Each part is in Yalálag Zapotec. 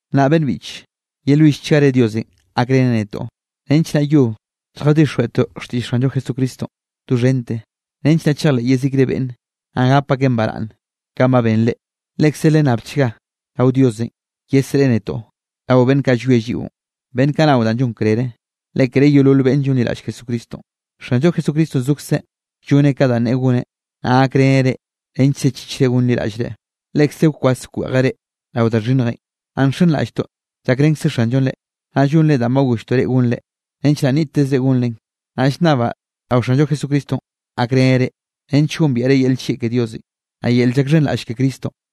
Nnaꞌ beꞌnn biꞌche, yelwillchgare Diosenꞌ gakreneꞌ netoꞌ, nench naꞌ yob lljadixjweꞌtoꞌ xtiꞌll Xanllo Jesucristonꞌ doxhente, nench naꞌ chejleꞌ yezikre beꞌnne, naꞌ gap akeꞌn baraꞌnne, kanꞌ ba ben reꞌ. Lekze lennabchga rao Diosenꞌ yesreꞌe netoꞌ rao beꞌnn kaꞌ llwie lliꞌon, beꞌnn kaꞌ nao da llon krere, le kere yeolol beꞌnne llonliraꞌll Jesucristonꞌ. Xanllo Jesucristonꞌ zokzeꞌ lloneꞌ ka danꞌ neꞌe goneꞌ, naꞌ gakreneꞌ reꞌ nench sechichre gonliraꞌllreꞌ. Lekze wkwas wkweꞌjeꞌ reꞌ rao da xhinnjenꞌ. Naꞌ nxenraꞌlltoꞌ llakrenkze Xanllonꞌ reꞌ, naꞌ llonre danꞌ ba golltoꞌ reꞌ gonrenꞌ, nench naꞌ nniꞌttezre gonren. Naꞌ llnnabaꞌ rao Xanllo Jesucristonꞌ gakreneꞌ reꞌ, nench gombiaꞌre yel nllieꞌ ke Diosenꞌ, naꞌ yel llakxhenraꞌll ke Cristonꞌ.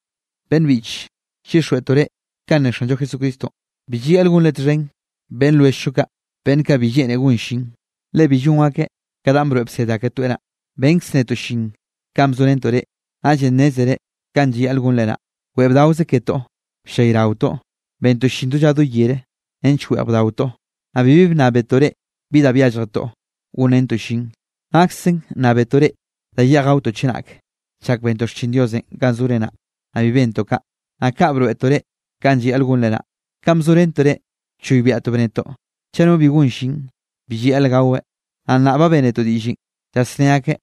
Beꞌnn biꞌche, llyixjweꞌtoꞌ reꞌ kanꞌ ne Xanllo Jesucristonꞌ, bi llayaꞌl gonre txhen beꞌnn lwelljllo kaꞌ beꞌnn kaꞌ bi lleꞌne gon llin, le bi llon akeꞌ ka danꞌ broeꞌ bsed aketoeꞌ naꞌ. Benkz netoꞌ llin kanꞌ bzorentoꞌ reꞌ, naꞌllenꞌ nnézere kanꞌ llayaꞌl gonre naꞌ. Weꞌe bdaokze ketoꞌ, bllayraotoꞌ bentoꞌ llin do lla do yere nench weꞌj bdaotoꞌ, naꞌ bibi bnnábetoꞌ reꞌ bi da byálljetoꞌ gonrentoꞌ llin. Naksen nnábetoꞌ reꞌ da yeꞌj gaotoꞌ chenake chak bentoꞌ xchin Diosenꞌ ganꞌ zore naꞌ, naꞌ bi bentoꞌ kaꞌ, naꞌ kaꞌ broeꞌtoꞌ reꞌ kanꞌ llayaꞌl gonre naꞌ. Kanꞌ bzorentoꞌ reꞌ bchoybiaꞌtoꞌ bnetoꞌ: “Chaꞌ no bi gon llin, bi llayaꞌl gaweꞌ.” Naꞌ nnaꞌ ba bénetoꞌ diꞌllenꞌ, llasné akeꞌ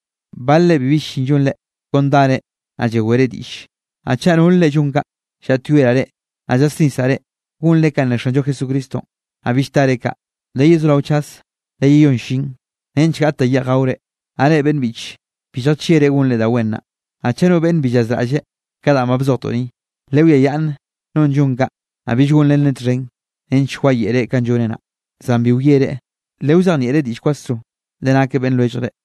balre bibi llin llonre, kon dare, naꞌ llawere diꞌlle. Naꞌ chaꞌ nol reꞌ llon kaꞌ, llaꞌtyoeraꞌ reꞌ, naꞌ llasnisraꞌ reꞌ, gonre kanꞌ ne Xanllo Jesucristonꞌ, naꞌ bill tare kaꞌ, leyezorao chaze leyeyón llin nench gaꞌt da yeꞌj gaore. Naꞌ reꞌ beꞌnn biꞌche, bi lljachieꞌre gonre da wen naꞌ. Naꞌ chaꞌ no beꞌnn bi llazraꞌlleꞌ ka danꞌ ba bzojtoꞌ ni, lewiayaꞌnne nonꞌ llon kaꞌ, naꞌ bill gonrenreꞌ txhen nench wayeꞌreꞌ kanꞌ lloneꞌ naꞌ. Zan bi wiereꞌ, lewzejnieꞌreꞌ diꞌll kwasroze, le nakeꞌ beꞌnn lwelljre.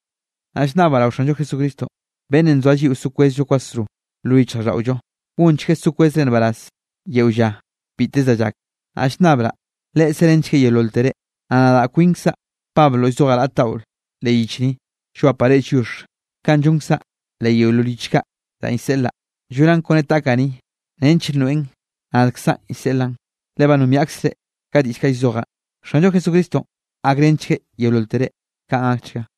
Nnaꞌ llnnabaꞌ rao Xanllo Jesucristonꞌ, beꞌnnenꞌ nzoa lliꞌo so kwezllo kwasro lo yichjraꞌlldaꞌollo, gonchgueꞌ so kwezre nbaraz yeo lla biteze da llak. Naꞌ llnnabraꞌ Leꞌe serenchgueꞌ yeololtere. Naꞌ nadaꞌ kwinkzaꞌ Pablo llzojaꞌ raꞌt daꞌo leꞌ yich ni, llwapaꞌ reꞌ lliox kanꞌ llonkzaꞌ leꞌ yeolol yich kaꞌ danꞌ llseꞌlaꞌ, llonaꞌn kone taꞌkaꞌ ni, nench nroeꞌn nadkzaꞌn llseꞌlaꞌn, le ba nombiaꞌkzre ka diꞌll kaꞌ llzojaꞌn. Xanllo Jesucristonꞌ gakrenchgueꞌ yeololtere. Kaꞌn gakchga.